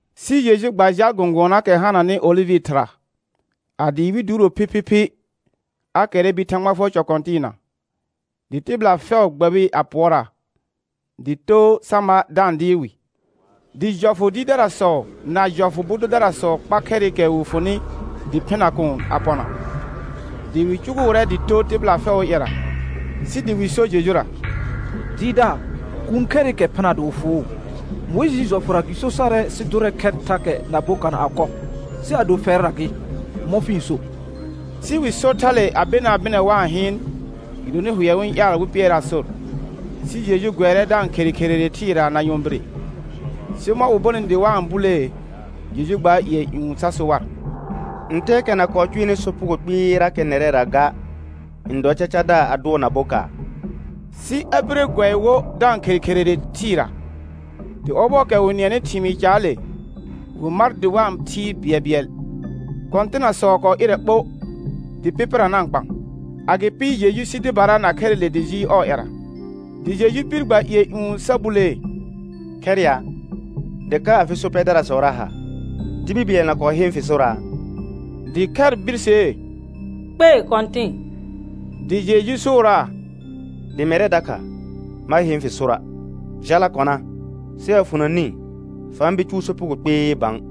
Sɩ Jeju gba jal gɔ̃gʋɔnaakɛ hananɩ olɩvɩ thɩra. A dɩɩ wɩl duuro phiphiphi, a kɛrrɛ bir Thãgba fʋɔr cɔ kɔ̃tɩɩna, dɩ tɩbɩla fɛʋ gbɛbɩ a pʋɔraa, dɩ too sa ma da-n dɩɩr wɩ. Dɩ jɔfʋ dɩɩrdarasɔ na jɔfʋ bʋ dʋdarasɔ kpa khɛrɩkɛ wɩ fʋnɩ dɩ phɩna kuun a pɔna. Dɩ wɩ cʋgʋʋrɛ dɩ too tɩbɩla fɛʋʋ ƴɛra, sɩ dɩ wɩ so Jejura: Dɩɩrdaar, kuun khɛrɩkɛ phɩna dɩ wɩ fʋʋ. Mʋɩjɩɩ jɔfʋra gɩ so sarɛ sɩ dʋrɛ khɛr thakɛ na bokana a kɔ. Sɩ ado fɛrra gɩ, mɔ̃ fɩ-n so? Sɩ wɩ sor thale a benaa bɩnɛ wa-n hɩɩn, gɩdonɩ hʋɛ wɩ-n ƴaal wɩ pɩɛraa sor. Sɩ Jeju gʋɛrɛ da-n khere kherere thɩɩra na nyɔ̃bire. Sɩ mɔ̃ wɩ bonɩ dɩ wa-n bulee, Jeju gbaar ƴɩɛ ƴũ sa so war: Ntɛɛkɛ na kɔɔ cʋɛnɩ sopugo kpɩɩrakɛ nɛrɛra ga n dɔ cacadaar a dʋɔ na bokaar. Sɩ a bire a gʋɛ wo da-n khere kherere thɩɩra. Dɩ ɔbɔɔkɛ wɩ nɩɛnɩ thɩmɩɩ caale, wɩ mar dɩ wa-n thɩɩr bɩɛlbɩɛl, kɔ̃tɩnasɔ kɔɔ ɩrɛ ɓo dɩ pɩpɩra na-n kpaan. Agɩpɩ Jeju sɩ dɩbara na khɛrɩle dɩ jɩɩl ɔɔ ƴɛra. Dɩ Jeju bir gba ƴɩɛ ƴũ sa bulee: Khɛr ya, dɩ ka afɩ so pɛdarasɔra ha? Tibil bɩɛl na kɔɔ heen fɩ soraa? Dɩ khɛr birsee: Kpei Kɔ̃tɩn. Dɩ Jeju sʋʋraa: Dɩ mɛrɛ dakha, ma heen fɩ sora'. Jala kɔna, sɩ a fʋna nĩ fa-n bir cʋʋ sopugo kpɩɩ bã.]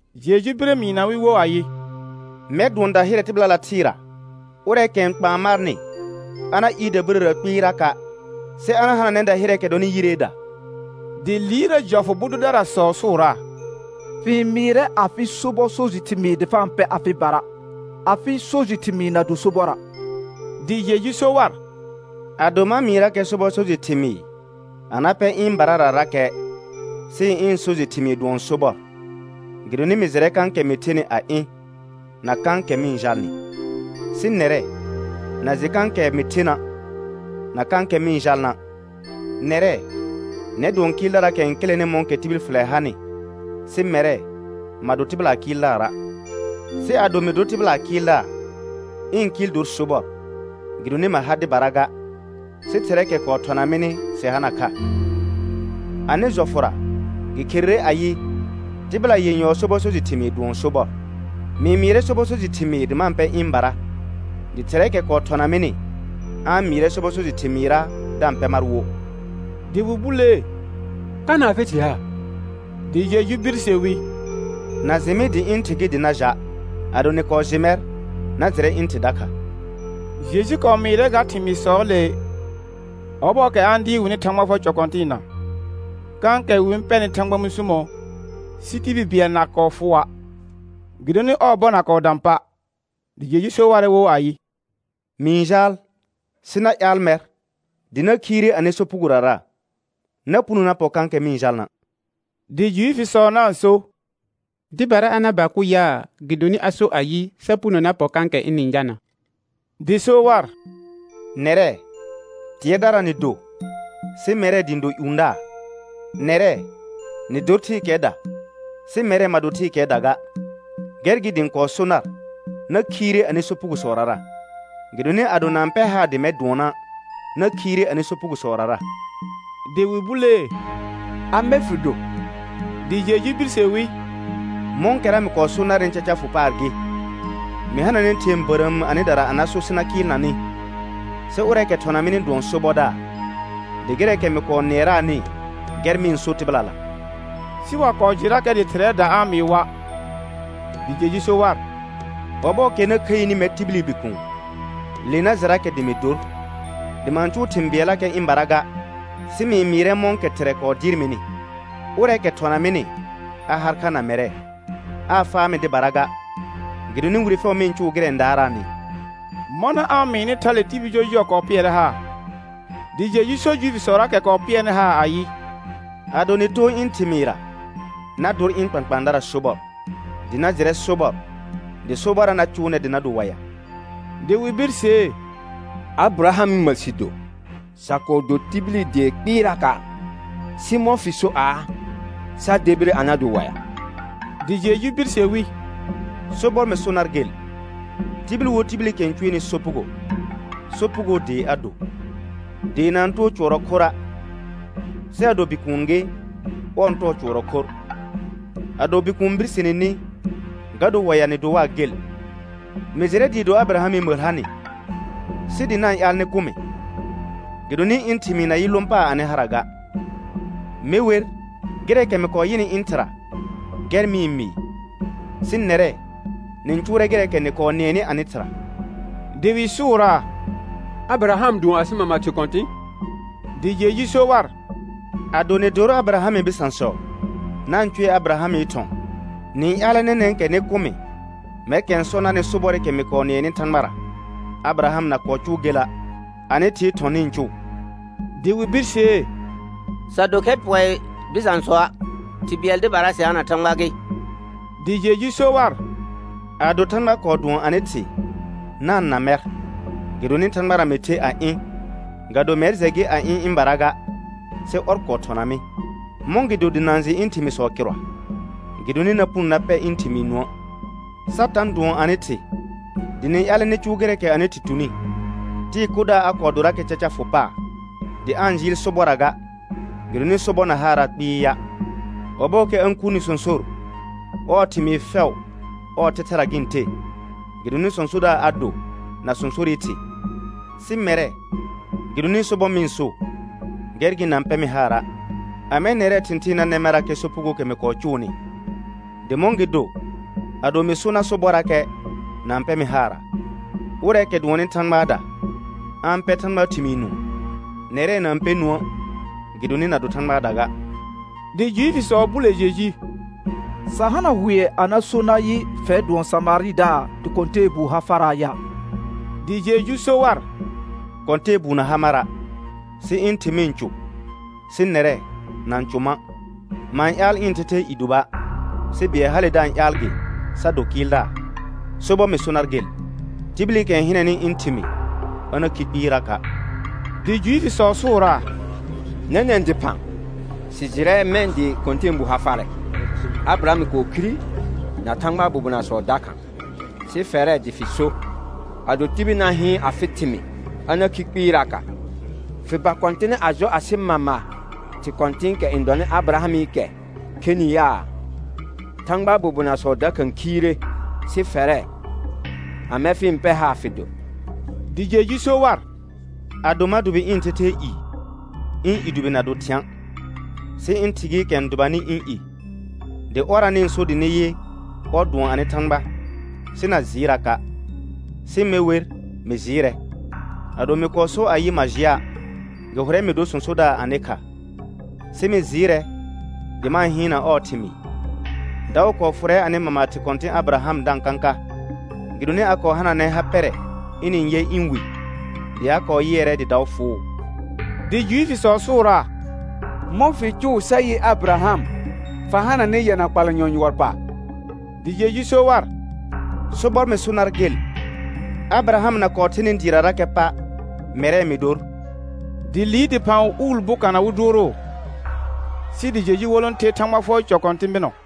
Jeju bire mɩɩna wɩ wo ayɩ: Mɛr dʋɔn dahɩrɛ tɩbɩlala thɩɩra. Ʋrɛɛkɛ n kpaan marnɩ a na ɩɩr dabirəra kpɩɩraka', sɩ a na hananɛ dahɩrɛɛkɛ dɔnɩ yireeda. Dɩ liirrə jɔfʋ bʋ dʋdarasɔ sʋʋraa: Fɩ-n mɩɩrɛ afɩ sobɔ so jɩ thɩmɩɩ dɩ fa-n pɛ afɩbara, afɩ so jɩ thɩmɩɩ na do sobɔra'. Dɩ Jeju so war: Ado ma mɩɩrakɛ sobɔ so jɩ thɩmɩɩr a na pɛ ɩ̃bararakɛ, sɩ ɩ̃ so jɩ thɩmɩɩ dʋɔn sobɔr, gɩdonɩ mɩ jɩrɛ kãkɛ mɩ thenɩ a ɩ̃, na kãkɛ mɩ-n jalnɩ. Sɩ nɛrɛ, na jɩ kãkɛ mɩ thena' na kãkɛ mɩ-n jalna'. Nɛrɛ, nɛr dɔ kɩɩldaraakɛ n kɩlɛnɩ mɔ̃kɛ tibil fɩlɛ hanɩ, sɩ mɛrɛ, ma do tɩbɩlaa Kɩɩldaara'. Sɩ ado mɩ dor tɩbɩlaa Kɩɩldaar, ɩ̃ kɩɩl dor sobɔr gɩdonɩ ma ha dɩbara ga, sɩ Thɩrɛɛkɛ kɔɔ thɔna mɩnɩ sɩ hana kha. Anɩ jɔfʋra gɩ kherere ayɩ: Tɩbɩla yenyɔɔ sobɔ so jɩ thɩmɩɩ dʋɔn sobɔr. Mɩ-n mɩɩrɛ sobɔ so jɩ thɩmɩɩr dɩ nɩa-n pɛ ɩ̃bara, dɩ Thɩrɛɛkɛ kɔɔ thɔna mɩnɩ a-n mɩɩrɛ sobɔ so jɩ thɩmɩɩrra da-n pɛ mar wo. Dɩ wɩ bulee: Kana afɩ thɩ ha? Dɩ Jeju birse wi: Na jɩ mɩ dɩ ɩ̃ Thɩ gɩ dɩ na ja'. Ado nɩ kɔɔ jɩ mɛr, na jɩrɛ ɩ̃ Thɩ dakha. Jeju kɔɔ mɩɩrɛ ga thɩmɩɩsɔɔle, ɔbɔɔkɛ a-n dɩɩr wɩnɩ Thãgba fʋɔr cɔ kɔ̃tɩɩna, kãkɛ wɩ-n pɛrnɩ Thãgba mũsumo, sɩ tibil bɩɛl na kɔɔ fʋʋa', gɩdonɩ ɔɔ bɔ na kɔɔ dã pa'. Dɩ Jeju so warɛ wo ayɩ: Mɩ-n jaal sɩ na ƴaal mɛr, dɩ na khiire anɩ sopugorara. Na puno na pɔ kãkɛ mɩ-n jalna'. Dɩ Juifisɔ na-n so: Dɩbara a na ba kʋ yaa, gɩdonɩ a sor ayɩ, sa puno na pɔ kãkɛ ɩnɩ-n jalna'. Dɩ so war: Nɛrɛ, tɩɛrdara nɩ do, sɩ mɛrɛ dɩ ɩ̃ do ƴũdaar. Nɛrɛ, nɩ dor thɩɩkɛɛda, sɩ mɛrɛ ma do thɩɩkɛɛda ga. Gɛr gɩ dɩ ɩ̃ kɔɔ so nar: Na khiire anɩ sopugosɔrara. Gɩdonɩ ado na-n pɛr haar dɩ mɛr dʋɔna', na khiire anɩ sopugosɔrara. Dɩ wɩ bulee: Amɛ fɩ do? Dɩ Jeju birse wi: Mɔ̃kɛra mɩ kɔɔ so narnɩ caca fʋ paar gɩ. Mɩ hananɛ thɩ̃ɛ bərəəm anɩdara a na so sɩ na kɩɩlna nɩ. Sɩ ʋrɛɛkɛ thɔna mɩnɩ dʋɔn sobɔdaar, dɩ gɩrɛɛkɛ mɩ kɔɔ nɩɛraanɩ gɛr mɩ-n so tɩbɩlala. Sɩ wa kɔɔ jɩrakɛ dɩ Thɩrɛɛda a-n mɩɩ wa'. Dɩ Jeju so war: Ɔbɔɔkɛ na khəini mɛr tibili Bikuun, le na jɩrakɛ dɩ mɩ dor dɩ ma-n cʋʋ thɩ̃ bɩɛllakɛ ɩ̃bara ga, sɩ mɩ-n mɩɩrɛ mɔ̃kɛ Thɩrɛ kɔɔ dɩɩr mɩnɩ. Ʋrɛɛkɛ thɔna mɩnɩ, a har kha na mɛrɛ. Aa faa mɩ dɩbara ga, gɩdonɩ wire fɛʋ mɩ-n eʋʋ gɩrɛ n daaraanɩ. Mɔna a-n mɩɩnɩ thale tibil jɔjʋɔ kɔɔ pɩɛrɛ haar. Dɩ Jeju so Juifisɔraakɛ kɔɔ pɩɛnɩ haar ayɩ: Ado nɩ too ɩ̃ thɩmɩɩra, na dor ɩ̃ kpãkpãadara sobɔr, dɩ na jɩrɛ sobɔr, dɩ sobɔrra na cʋʋ nɛr dɩ na do waɩa. Dɩ wɩ birsee: Abɩrahamɩ məl sɩ do, sa kɔɔ do tibili dee kpɩɩraka', sɩ mɔ̃ fɩ so aa, sa debire a na do waɩa? Dɩ Jeju birse wi: Sobɔr mɩ so nar gel, tibil wo tibilikɛ n cʋɛnɩ sopugo, sopugoo dee a do. Dee na-n too cʋɔrɔ khorra', sɩ ado bikuun gɩ, ɔr n tɔɔ cʋɔrɔ khorr. Ado Bikuun birsene ni ga dor waɩa nɩ do waa gel. Mɩ jɩrɛ dɩɩ do Abɩrahamɩ məl ha nɩ, sɩ dɩ na-n ƴaal nɩ kʋ mɩ, gɩdonɩ ɩ̃ thɩmɩɩ na yɩ lõ paar anɩ hara ga. Me wer, gɩrɛɛkɛ mɩ kɔɔ yɩnɩ ɩ̃ Thɩra gɛr mɩ-n mɩɩ. Sɩ nɛrɛ, nɩ-n cʋʋrɛ gɩrɛɛkɛ nɩ kɔɔ nɩɛnɩ anɩ thɩra. Dɩ wɩ sʋʋraa: Abɩraham dʋɔn asɩ mama thɩ kɔ̃tɩ̃. Dɩ Jeju so war: Ado nɩ dor Abɩrahamɩ bɩsãsɔ, na-n cʋɛ Abɩrahamɩ thɔ̃. Nɩ-n ƴaalɛ nɛnɛ̃kɛ nɩ kʋ mɩ mɛrkɛ sɔ narnɩ sobɔrɩkɛ mɩ kɔɔ nɩɛnɩ Thãgbara. Abɩraham na kɔɔ cʋʋ gela'. Anɩ thɩɩ thɔ̃ nɩ-n cʋʋ. Dɩ wɩ birsee: Sa do khɛr pɔɩ bɩsãsɔa', Thɩ bɩɛl dɩbara sɩ hana Thãgba gɩ. Dɩ Jeju so war: Ado Thãgba kɔɔ dʋɔn anɩ Thɩ na-n na mɛr, gɩdonɩ Thãgbara mɩ the a ɩ̃. Ga do mɛr jɛ gɩ a ɩ̃ ɩ̃bara ga, sɩ ɔr kɔɔ thɔna mɩ. Mɔ̃gɩdo na-n jɩ ɩ̃ thɩmɩɩsɔ kɩrʋa? Gɩdonɩ na puno na pɛ ɩ̃ thɩmɩɩ nũə'. Satã dʋɔn anɩ thɩ, dɩ nɩ-n ƴaalɛ nɩ cʋʋ gɩrɛɛkɛ anɩ thɩ tuni. Tɩɩ kʋdaar a kɔɔ dorakɛ caca fʋ paar, dɩ aa-n jɩɩl sobɔrra ga, gɩdonɩ sobɔr na haaraa kpɩɩa'. Ɔbɔɔkɛ a-n kurni sõsor, ɔɔ thɩmɩɩ fɛʋ ɔɔ thɛthɛra gɩ-n the, gɩdonɩ sõsodaar a do na sõsorɩ thɩ. Sɩ mɛrɛ gɩdonɩ sobɔr mɩ-n so, gɛr gɩ na-n pɛ mɩ haara'. Amɛ nɛrɛɛ thɩ̃thɩɩn na nɛ marrakɛ sopugookɛ mɩ kɔɔ cʋʋnɩ? Dɩ mɔ̃gɩdo, ado mɩ so nar sobɔrrakɛ, na-n pɛ mɩ haara? Ʋrɛɛkɛ dʋɔnnɩ Thãgbaada, a-n pɛr Thãgbaa thɩmɩɩ nũu. Nɛrɛ, na-n pɛ nũə' gɩdonɩ na do Thãgbaada ga. Dɩ Juifisɔ bule Jeju: Sa hana hʋɛ a na so nayɩ, fɛr dʋɔn Samarɩdaar dɩ kɔ̃tɛɛbuu ha faraa ya? Dɩ Jeju so war: Kɔ̃tɛɛbuu na ha mara', sɩ ɩ̃ Thɩ mɩ-n cʋ. Sɩ nɛrɛ, na-n cʋ ma'. Ma-n ƴaal ɩ̃ thɛthɛɛ i dʋba', sɩ bɩɛl hale da-n ƴaal gɩ sa do Kɩɩldaar. Sobɔr mɩ so nar gel, tibilikɛ n hɩnɛnɩ ɩ̃ thɩmɩɩ, a na khi kpɩɩraka'. Dɩ Juifisɔ sʋʋraa: Nɛnɛ̃ dɩphã, sɩ jɩrɛ mɛ̃ dɩ kɔ̃tɛɛbuu ha farɛ. Abɩraham kɔɔ khire na Thãgbaa bobonasɔ dakha, sɩ fɛrɛ dɩ fɩ so: Ado tibil na hɩɩn afɩ thɩmɩɩ a na khi kpɩɩraka'. Fɩ ba kɔ̃tɩnɛ a jɔ asɩ mama thɩ kɔ̃tɩ̃ɩkɛ n dɔnɩ Abɩrahamɩkɛ khenɩ yaa? Thãgbaa bobonasɔ dakha khiire; sɩ fɛrɛ, amɛ fɩ-n pɛr haar fɩ dor? Dɩ Jeju so war: Ado ma dʋbɩ ɩ̃ thɛthɛɛ i, ɩ̃ i dʋbɩ na do thɩ̃a'. Sɩ ɩ̃ Thɩ gɩɩkɛ n dʋbanɩ ɩ̃ i, dɩ ɔrra nɩ-n so dɩ nɩ yɩ, ɔr dʋɔn anɩ Thãgba. Sɩ na jɩɩraka', sɩ me wer, mɩ jɩɩrɛ. Ado mɩ kɔɔ sor ayɩ ma jɩa', gɩ hʋrɛ mɩ dor sõsodaar anɩ kha. Sɩ mɩ jɩɩrɛ dɩ ma-n hɩɩnna ɔɔ thɩmɩɩ. Daʋ kɔɔ fʋrɛ anɩ mama thɩ kɔ̃tɩ̃ Abɩraham da-n kãka, gɩdonɩ a kɔɔ hananɛ ha pɛrɛ ɩnɩ-n yɛ ɩ̃ Wi. Dɩ a kɔɔ yɩɛrɛ dɩ daʋ fʋʋ. Dɩ Juifisɔ sʋʋraa: Mɔ̃ fɩ cʋʋ sa yɩ Abɩraham, fa hananɩ yɛna kpalanyɔ yʋɔr pa? Dɩ Jeju so war: Sobɔr mɩ so nar gel, Abɩraham na kɔɔ thenɩ dɩɩrarakɛ pa', mɛrɛ mɩ dor. Dɩ liir dɩphã mɛ̃ wɩ uul bokana wɩ dʋʋrʋʋ, sɩ dɩ Jeju wolõ the Thãgba fʋɔr cɔ kɔ̃tɩ̃ bɩnɔ.